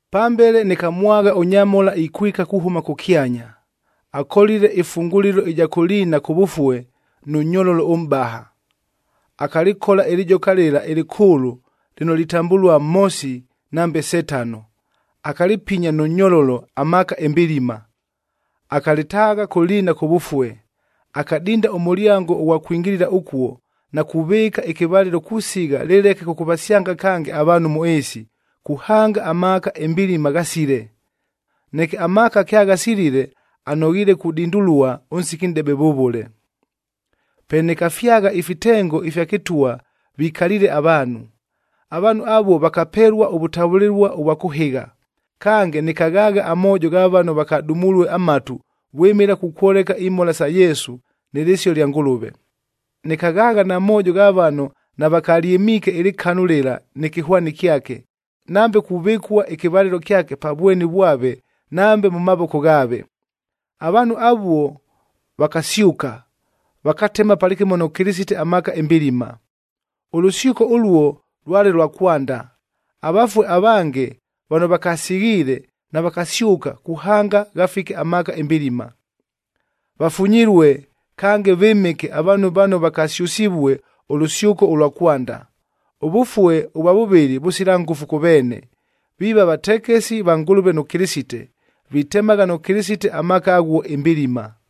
Pambele nɨkamwagha ʉnyamhola ikwika kuhʉma kʉkyanya, akolile ɨfungulilo ɨja kʉ liina kʉvʉfue nʉ nyololo ʉmʼbaha. Akalɨkola ɨlɨjoka lɨla ɨlɨkʉʉlʉ lɨno litambʉlua Mhosi nambe Setano, akalɨpinya nʉ nyololo amaaka ɨmbilima. Akalɨtaagha kʉ liina kʉvʉfue. Akadinda ʉmʉlyango ʉghwa kwingilila ʉkuo na kuvɨɨka ɨkɨvalɨlo kusigha lɨleke kʉkʉvasyanga kange avaanhu mʉ ɨɨsi, kuhanga amaaka ɨmbilima ghasile. Neke amaaka kyaghasilile, anoghiile kudindulua ʉnsiki nʼdebe vʉvʉle. Pe nɨkafyagha ifitengo ifya kɨtwa vikaliile avaanhu. Avaanhu avuo vakapelua ʉvʉtavʉlɨlua ʉvwa kʉhɨgha. Kange, nɨkaghaagha amoojo gha vano vakadumulue amatu vwɨmɨla kukwoleka imhola sa Yesu nɨ lɨsio lya Ngʉlʉve. Nɨkaghaagha na moojo gha vano navakalyɨmiike ɨlɨkanu lɨla nɨ kɨhwani kyake, nambe kuvɨkua ɨkɨvalɨlo kyake pa vweni vwave nambe mʉ mavoko ghaave. Avaanhu avuo vakasyʉka, vakatema palɨkɨmo nʉ Kɨlɨsite amaaka ɨmbilima. Ʉlʉsyʉko ʉluo lwale lwa kwanda. Avafue avange vano vakasighiile navakasyʉka kuhanga ghafike amaaka ɨmbilima. Vafunyilue, kange vɨmɨke avaanhu vano vakasyʉsivue ʉlʉsyʉko ʉlwa kwanda. Ʉvʉfue ʉvwa vʉvɨlɨ vʉsila ngʉfu kʉ veene, viiva vatekesi va Ngʉlʉve nʉ Kɨlɨsite, vitemagha nʉ Kɨlɨsite amaaka aghuo ɨmbilima.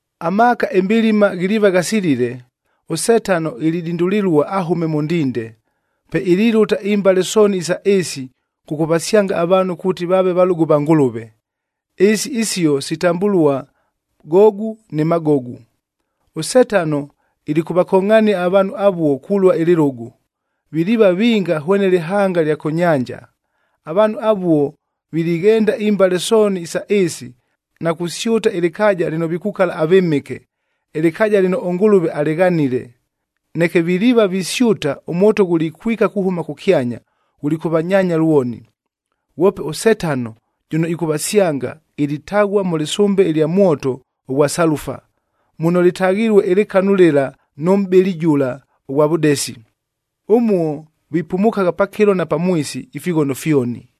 Amaaka ɨmbilima ghiliiva ghasilile, ʉSetano ilidindulilua ahʉme mʉ ndinde. Pe ililʉta imbale sooni isa ɨɨsi kʉkʉvasyanga avaanhu kuuti vaave valʉgʉ va Ngʉlʉve, ɨɨsi isio sitambʉlua Gogu nɨ Magogu.a ɄSetano ilikʉvakongʼhania avaanhu avuo kulua ɨlɨlʉgʉ, viliiva vinga hwene lɨhanga lya kʉ nyanja. Avaanhu avuo vilighenda imbale sooni isa ɨɨsi na kusyʉta ɨlɨkaaja lɨno vikukala avɨmɨke, ɨlɨkaaja lɨno ʉNgʉlʉve alɨghanile. Neke viliiva visyʉta, ʉmwoto ghulikwika kuhʉma kʉkyanya, ghulikʉvanyaanya lwoni. Ghwope ʉSetano jʉno ɨkʉvasyanga, ilitaghua mʉ lɨsʉmbe ɨlya mwoto ʉghwa salufa, muno lɨtaghilue ɨlɨkanu lɨla nʉ mʼbɨli jʉla ʉghwa vʉdesi. Ʉmuo vipumukagha pakɨlo na pamwisi, ifighono fyoni.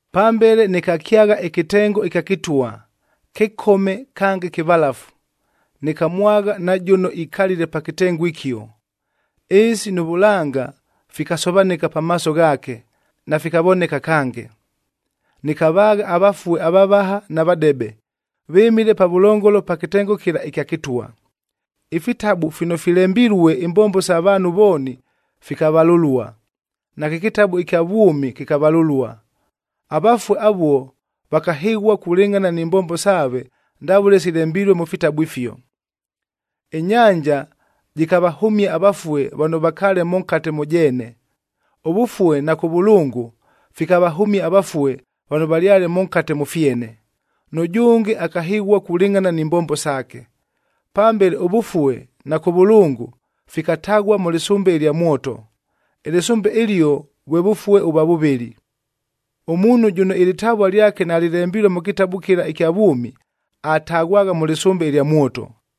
Pambele nɨkakyagha ɨkɨtengo ɨkya kɨtwa, kɨkome kange kɨvalafu, nɨkamwagha na jʉno ikalile pa kɨtengo ɨkio. Ɨɨsi nʉ vʉlanga fikasovanɨka pamaaso ghaake, nafikavoneka kange. Nɨkavaagha avafue avavaha na vadebe, vɨmile pavʉlongolo pa kɨtengo kɨla ɨkya kɨtwa. Ifitabu fino filembilue imbombo sa vaanhu vooni fikavalʉlua, nakɨ kɨtabu ɨkya vwʉmi kɨkavalʉlua. Avafue avuo vakahɨghua kulɨngʼhana ni mbombo saave ndavʉle silembilue mʉ fitabu ifio. Ɨnyanja jɨkavahʉmia avafue vano vakaale mʉnkate mʉ jeene. ɄVʉfue na Kʉvʉlʉngʉ fikavahʉmia avafue vano valyale mʉnkate mʉ fyene. Nʉjʉnge akahɨghua kulɨngʼhana ni mbombo saake. Pambele ʉVʉfue na Kʉvʉlʉngʉ fikataghua mʉ lɨsʉmbe ɨlya mwoto. Ɨlɨsʉmbe ɨlio vwe vʉfue ʉvwa vʉvɨlɨ. Ʉmuunhu jʉno ɨlɨtavua lyake nalɨlembilue mʉ kɨtabu kɨla ɨkya vwʉmi, ataghwagha mʉ lɨsʉmbe ɨlya mwoto.